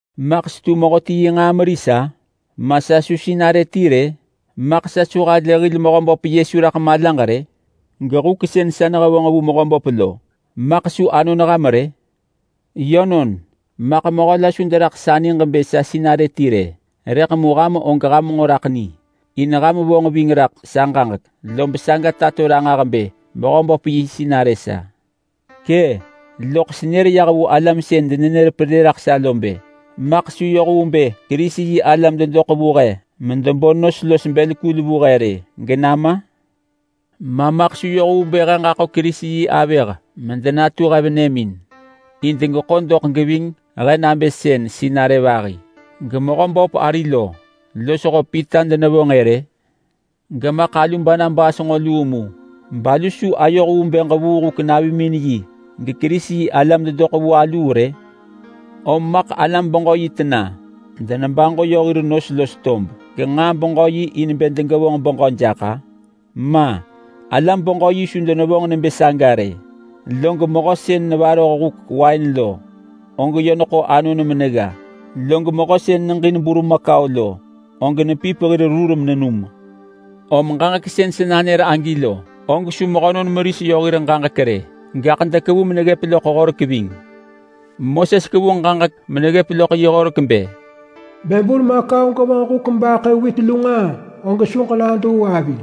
Maḳ setu mehöti yi nġaa meris-a? Ma sa su sinarë ti rë? Maḳ sa su halë hil Mehöböp Yesu raḳ malaġ rë? Gehuk sën sa nehevonġ vu Mehöböp lo, maḳ su anon ham rë? Yönon maḳ mehö la su deraḳ sa niġ bë sa sinarë ti rë, rëḳ mu ham og ham nġo raḳ ni, in ham vonġ ving raḳ sa ġaġek, lob saga tato ranġah bë Mehöböp yi sinarë sa. Kë’! Loḳ senër yah vu alam sën denenër pelë raḳ sa lo bë: Maḳ su yoh vu bë Kerisi-yi-alam dedoḳ vu he medebo nos los bël kul vu he rë genama? Ma maḳ su yoh vu bë he ġaḳo Kerisi yi avëh medenatu he venëmin in degeḳo doḳ geving he nabë sën sinarë vahi geMehöböp ari lo losho Pita denevonġ-ë rë? Gemaḳ alu Barnabas nġo luu mu, balu su ayoh vu bë ġevuu huk navimin yi geKerisi-yi-alam dedoḳ vu aluu rë? Om maḳ alam-beġö-yi tena denebaġo yö hir nos los tob genġaa beġö yi in bë degevonġ beġö jaḳ-a? Ma! Alam-beġö-yi su denevonġ nebë saga rë! Log mehö sën nevaroh huk wain lo, og yö neḳo anon menegga. Log mehö sën neġin burmakau lo, og nepip hir rur menenum. Om ġaġek sën sa nanër agi lo, og su mehönon meris yö hir ġaġek rë, gaḳ dekevu meneggëp loḳ Horek ving. Moses kevu ġaġek meneggëp loḳ yi horek bë, “Bë burmakau gevonġ huk mebaḳë wit lu nġaa, og su ġenaduu avi.”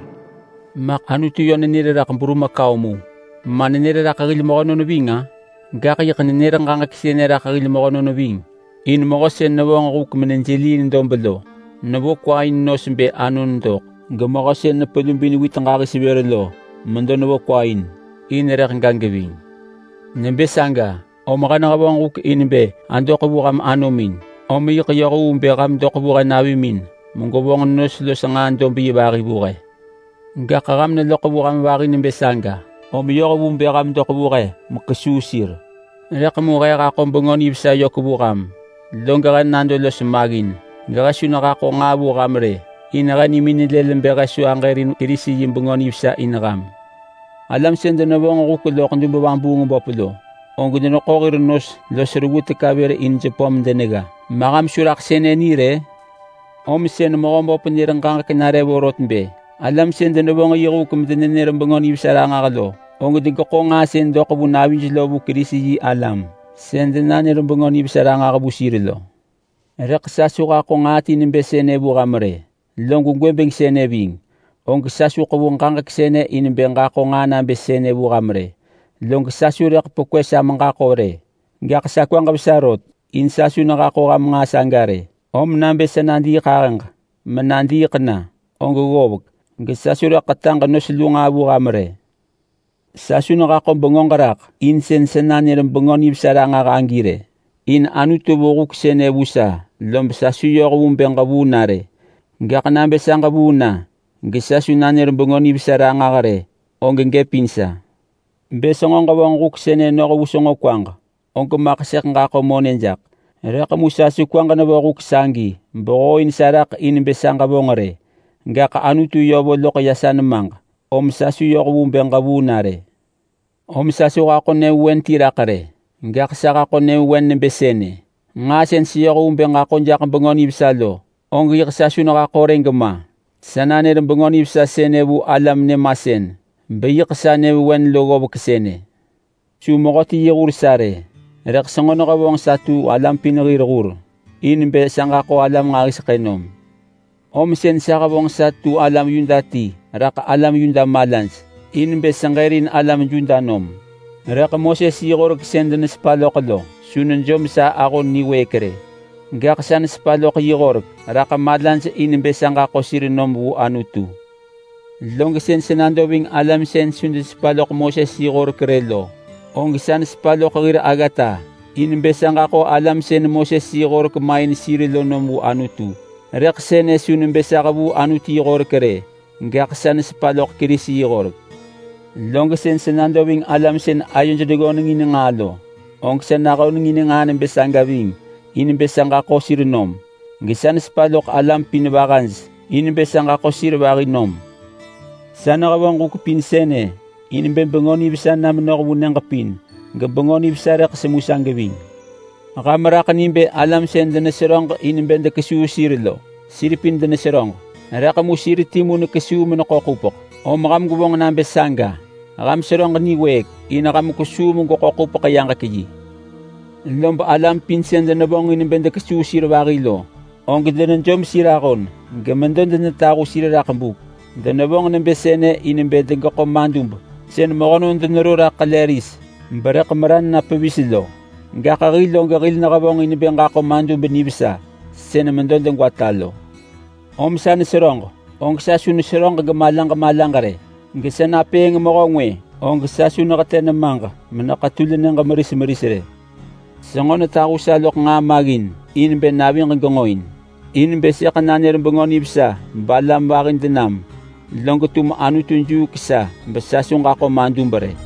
Maḳ Anutu yö nër raḳ burmakau mu, ma nenër raḳ hil mehönon ving-a? Gaḳ yiḳ nenër ġaġek sënë raḳ hil mehönon ving! In mehö sën nevonġ huk menejeliiin dob lo nevo kwa in nos bë anon doḳ, gemehö sën nepelubin wit ġahis vër lo medo nevo kwa in in rëḳ ga geving. Nebë saga, om he nehevonġ huk in bë adoḳ vu ham anomin, om yiḳ yoh vu bë ham doḳ vu he navimin megwevonġ nos los nġaa dob yi vahi vu he! Gaḳ ham neloḳ vu alam vahi nebë saga, om yoh vu bë ham doḳ vu he mekesuu sir. Rëḳ mu he haḳo Bengö Nivesa yök vu ham, log he nado los maggin gehe su nehaḳo nġaa vu ham rë, in he nimin lël bë he su aġërin Kerisi yi Bengö Nivesa in ham. Alam sën denevonġ huk loḳ dub-vabuung-böp lo, og deneḳo hir nos los reggu teka vër in jepö medenegga. Ma ham su raḳ sënë ni rë? Om sën Mehöböp nër ġaġek nare vorot bë alam sën denevonġ yi huk medenenër Bengö Nivesa ranġah lo, og degeḳo nġaa sën doḳ vu navij lo vu Kerisi-yi-alam sën denanër Bengö Nivesa ranġah vu sir lo. Rëḳ sa su haḳo nġaa ti nebë sënë vu ham rë. Log gwëbeng sënë ving og sa su ḳevu ġaġek sënë in bë ġaḳo nġaa nabë sënë vu ham rë, log sa su rëḳ pekwë sa meġaḳo rë, gaḳ sa kwaġ vesa rot in sa su nehaḳo ham nġaa saga rë. Om nabë sa nadiiḳahëġ menadiiḳ na, og ggovek gesa su rëḳ ḳetaġ nos lu nġaa vu ham rë. Sa su nehaḳo bengöġ raḳ in sën sa nanër Bengö Nivesa ranġah agi rë, in Anutu vo huk sënë vu sa lob sa su yoh vu bë ġevuu na rë. Gaḳ nabë sa ġevuu na gesa su nanër Bengö Nivesa ranġah rë, og gëp in sa! Bë senġo ġevonġ huk sënë noh vu senġo kwaġ, og maḳ sëḳ ġaḳo monë jaḳ. Rëḳ mu sa su kwaġ nevo huk sagi behooin sa raḳ in bë sa ġevonġ rë, gaḳ Anutu yö vo loḳ ya sa nemaġ om sa su yoh vu bë ġevuu na rë. Om sa su haḳo nyëvewen ti raḳ rë, gaḳ sa haḳo nyëvewen nebë sënë: Nġaa sën seyoh vu bë ġaḳo jaḳ Bengö Nivesa lo, og yiḳ sa su nehaḳo rë gema. Sa nanër Bengö Nivesa sënë vu alam nyëmasën beyiḳ sa nyëvewen lo ggovek sënë. Su mehöti yi hur sa rë! Rëḳ senġo nehevonġ sa tu alam pin hir hur in bë sa ġaḳo alam nġahiseḳë nom. Om sën sa hevonġ sa tu alam Yuda ti raḳ alam Yuda malaj in bë seġërin alam Yuda nom. Rëḳ Moses yi horek sën denesepa loḳ lo su nejom sa ahon niwëëk rë, gaḳ sa nesepa loḳ yi horek raḳ malaj in bë sa ġaḳo sir nom vu Anutu. Log sën sa nado ving alam sën su denesepa loḳ Moses yi horek rë lo, og sa nesepa loḳ hir aggata in bë sa ġaḳo alam sën Moses yi horek main sir lo nom vu Anutu. Rëḳ sënë su nebë sa hevuu Anutu yi horek rë, gaḳ sa nesepa loḳ Kerisi yi horek. Log sën sa nado ving alam sën ayoj neggönengin nġaa lo, og sa nahönengin nġaa nebë saga ving in bë sa ġaḳo sir nom. Gesa nesepa loḳ alam pin vahaj in bë sa ġaḳo sir vahi nom. Sa nehevonġ huk pin sënë in bë Bengö Nivesa na menoh vu nyëġ pin geBengö Nivesa rëḳ semu sa geving. Ham raḳ ni bë alam sën deneseröġ in bë dekesuu sir lo, sir pin deneseröġ, rëḳ mu sir timu nekesuu meneḳo ḳupeḳ. Om ham gwevonġ nabë saga! Ham seröġ niwëëk in ham kwesuu megweḳo ḳupeḳ-yaġek-yi. Lob alam pin sën denevonġin bë dekesuu sir vahi lo, og denejom sir ahon gemedo denetahu sir raḳ buk. Denevonġ nebë sënë in bë degeḳo madub sën mehönon denero raḳ ḳele ris, berëḳ meran na pevis lo, gaḳ hil og hil nehevonġ in bë ġaḳo madub nivesa sën medo degwata lo. Om sa neseröġ, og sa su neseröġ gemalaġ malaġ rë; gesa napëëng mehö ngwë, og sa su nehetë nemaġ meneḳetul nyëġ meris meris rë. Senġo netahu sa loḳ nġaa maggin in bë naviġ genġoin. In bë sëḳ nanër balam vahi denam log tum Anutu juuk sa besa medo tamu.